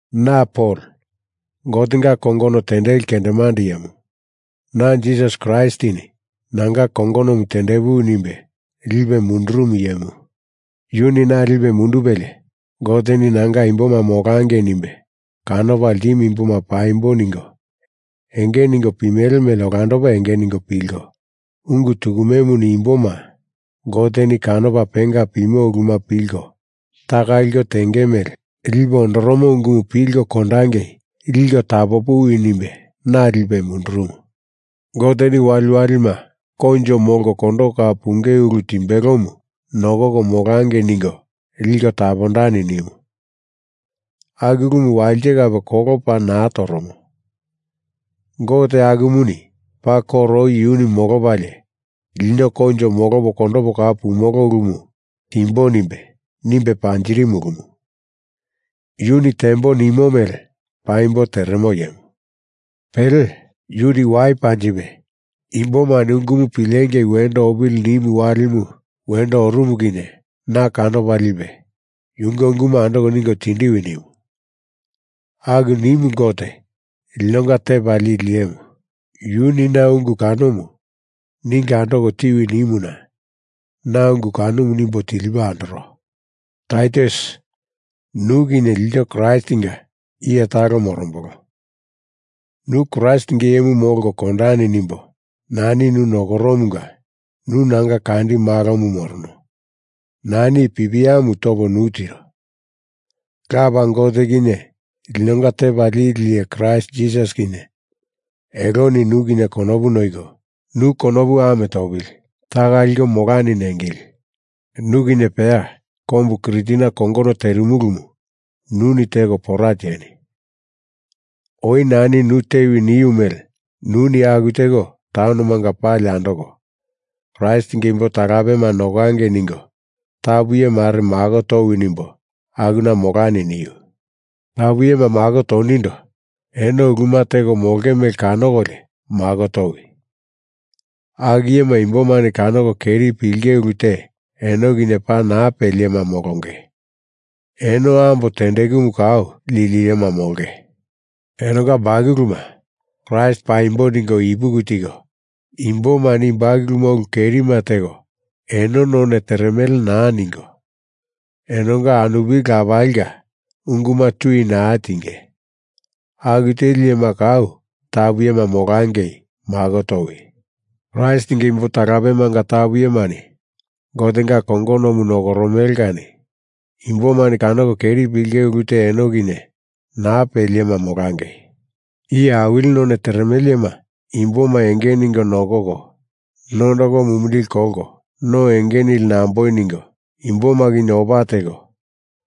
Na Pol, Gotenga kongono tendeli kendemande iyemu. Na Jisas Kraistini nanga kongonomu tendepuwi nimbe lipe mundurumu iyemu. Yuni na lipe mundupelie, Goteni nanga imboma molangei nimbe kanopa ltimu imboma paimbo ningo enge ningo pimele mele olandopa enge ningo pilko, ungu tukumemuni imboma Goteni kanopa penga pimo uluma pilko taka liko tenge mele lipe ondoromo ungumu pilko kondangei liko tapopuwi nimbe na lipe mundurumu. Goteni waliwalima koinjo molko kondoko kau punge ulu timbelomu nokoko molangei ningo liko tapondani nimu. Aku ulumu walite kape kolo paa naa toromo Gote akumuni paa koro oi yunu molopalie lino koinjo molopo kondopo kau pumolo ulumu timbo nimbe, nimbe panjirimu ulumu. Yuni tembo nimo mele paimbo teremo iyemu. Pele, yunu wai panjipe imbomani ungumu pilengei wendo opili nimu walimu wendo orumu kinye na kanopa lipe yunge ungumu andoko ningo tindiwi nimu. Aku nimu Gote, linonga Tepa Lili Iyemu. Yuni na ungu kanomu ningo andoko tiwi nimuna na ungu kanomu nimbo tilipo andoro. Taitus, nu kinye ilto Kraistinga iye talo morombolo. Nu Kraistinga iyemu molko kondani nimbo nani nu nokoromunga nu nanga kandi malomu morono, nani i pipiamu topo nu tiro. Lapa Gote kinye, linonga Tepa Lili Iye Kraist Jisas kinye, eloni nu kinye konopu noiko, nu konopu ame topili taka liko molani nengili. Nu kinye peya kombu Kritina kongono terimulumu nuni teko pora tieni. Oi nani nu tewi niu mele nuni aku teko taunomanga pali andoko Kraistinga imbo talapema nokangei ningo tapu iye mare mako towi nimbo akuna molani niu. Tapu iyema mako tonindo eno uluma teko molonge mele kanokolio mako towi. Aku iyema imbomani kanoko keri pilinge ulu te eno kinye naa peli iyema molonge. Eno ambo tendekumu kau lili iyema molonge. Enonga bakuluma Kraist paimbo ningo ipuki tiko, imbomani i bakuluma ulu kerima teko eno none teremele naa ningo, enonga anupili lapalinga unguma tui naa tinge. Aku teli iyema kau tapu iyema molangei mako towi. Kraistinga imbo talapemanga tapu iyemani Gotenga kongonomu nokoromele kani imbomani kanoko keri pilinge ulu te eno kinye naa peli iyema molangei. Iye awili none teremele iyema imboma enge ningo nokoko, nondoko mumindili kolko, no enge nili namboi ningo, imboma kinye opa teko,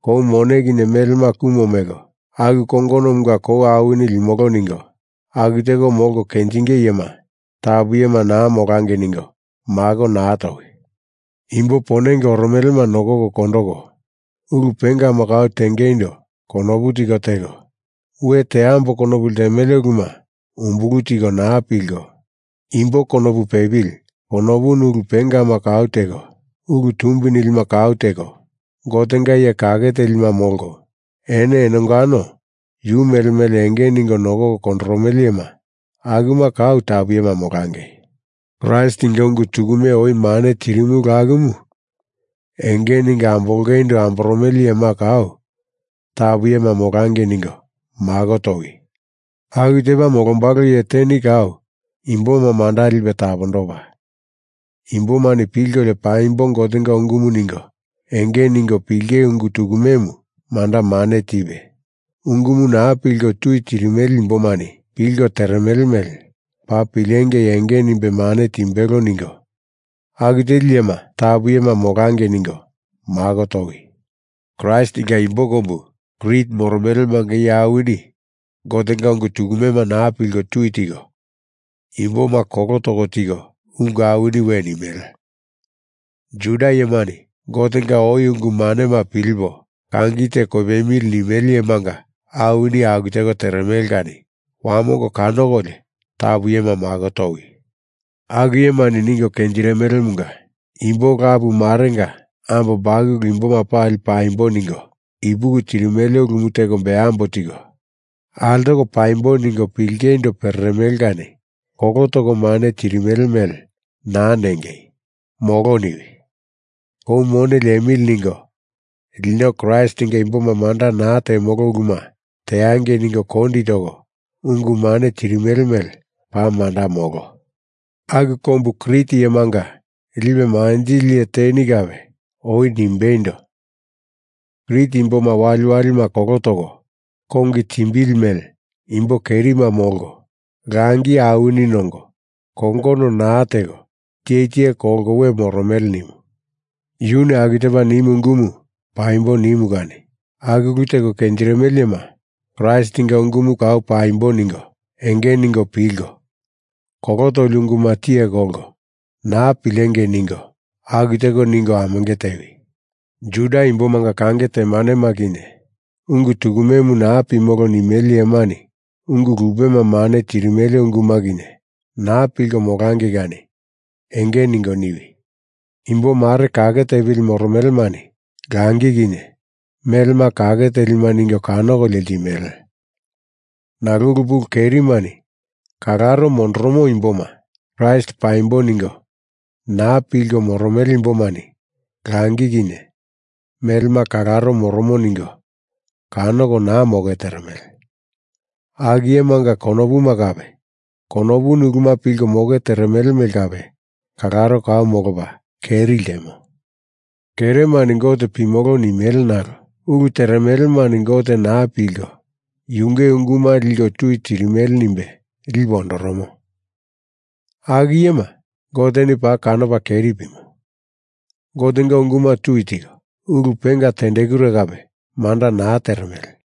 kou mone kinye melema kumo meko aku kongonomunga kou awini limolo ningo, aku teko molko kenjinge iyema tapu iyema naa molangei ningo mako naa towi. Imbo ponenge oromelema nokoko kondoko, ulu pengama kau tengeindo konopu tiko teko, we teambo konopu ltemele uluma umbulu tiko naa pilko, imbo konopu pepili konopuni ulu pengama kau teko, ulu tumbi nilima kau teko, Gotenga iye kake telima molko, eno enongano yu mele mele enge ningo nokoko kondoromele iyema akuma kau tapu iyema molangei. Kraistinga ungu tukume oi mane tirimulu akumu enge ningo ambolongeindo amboromele iyema kau tapu iyema molangei ningo mako towi. Aku tepa molombalo iye teni kau imboma manda lipe tapondopa, imbomani pilkolio paimbo Gotenga ungumu ningo enge ningo pilinge ungu tukumemu manda mane tipe, ungumu naa pilko tui tirimele imbomani pilko teremele mele paa pilengei enge nimbe mane timbelo ningo aku teli iyema tapu iyema molangei ningo mako towi. Kraistinga imbo kombu Krit moromelemanga iye awini Gotenga ungu tukumema naa pilko tui tiko, imboma kolo toko tiko ungu awini we nimele. Juda iyemani Gotenga oi ungu manema pilipo kangi te kopemili nimele iyemanga awini aku teko teremele kani wamongo kanokolio tapu iyema mako towi. Aku iyemani ningo kenjirimelemunga imbo lapu marenga ambo bakulu imboma pali paimbo ningo ipuki tirimele ulumu teko embambo tiko altoko paimbo ningo pilingeindo pereremele kani kolo toko mane tirimele mele naa nengei, molo niwi. Kou mone liemili ningo lino Kraistinga imboma manda naa temolo uluma teangei ningo kondi toko ungu mane tirimele mele paa manda molo. Aku kombu Krit iyemanga lipe manjili iye teni kape oi nimbeindo, Krit imboma waliwalima kolo toko, kongi timbili mele imbo kerima molko, langi awini nongo kongono naa teko tiye tiye kolko we moromele, nimu. Yuni aku tepa nimu ungumu paimbo nimu kani aku ulu teko kenjirimele iyema Kraistinga ungumu kau paimbo ningo enge ningo pilko, kolo toli unguma tiye kolko naa pilengei ningo aku teko ningo amenge tewi. Juda imbomanga kange temanema kinye, ungu tukumemu naa pimolo nimele iyemani ungu lupema mane tirimele unguma kinye, naa pilko molangei kani enge ningo niwi. Imbo mare kake tepili moromelemani langi kinye melema kake telima ningo kanokolio ltimele. Nalo ulu pulu kerimani kalaro mondoromo imboma, Kraist paimbo ningo naa pilko moromele imbomani langi kinye melema kalaro moromo ningo kanoko naa moke teremele. Aku iyemanga konopuma kape konopuni uluma pilko moke teremele mele kape kalaro kau molopa keri ltemo. Keremani Gote pimolo nimele nalo ulu teremelemani Gote naa pilko yunge unguma liko tui tirimele nimbe lipe ondoromo. Aku iyema Goteni paa kanopa keri pimo. Gotenga unguma tui tiko, ulu penga tendekure kape manda naa teremele.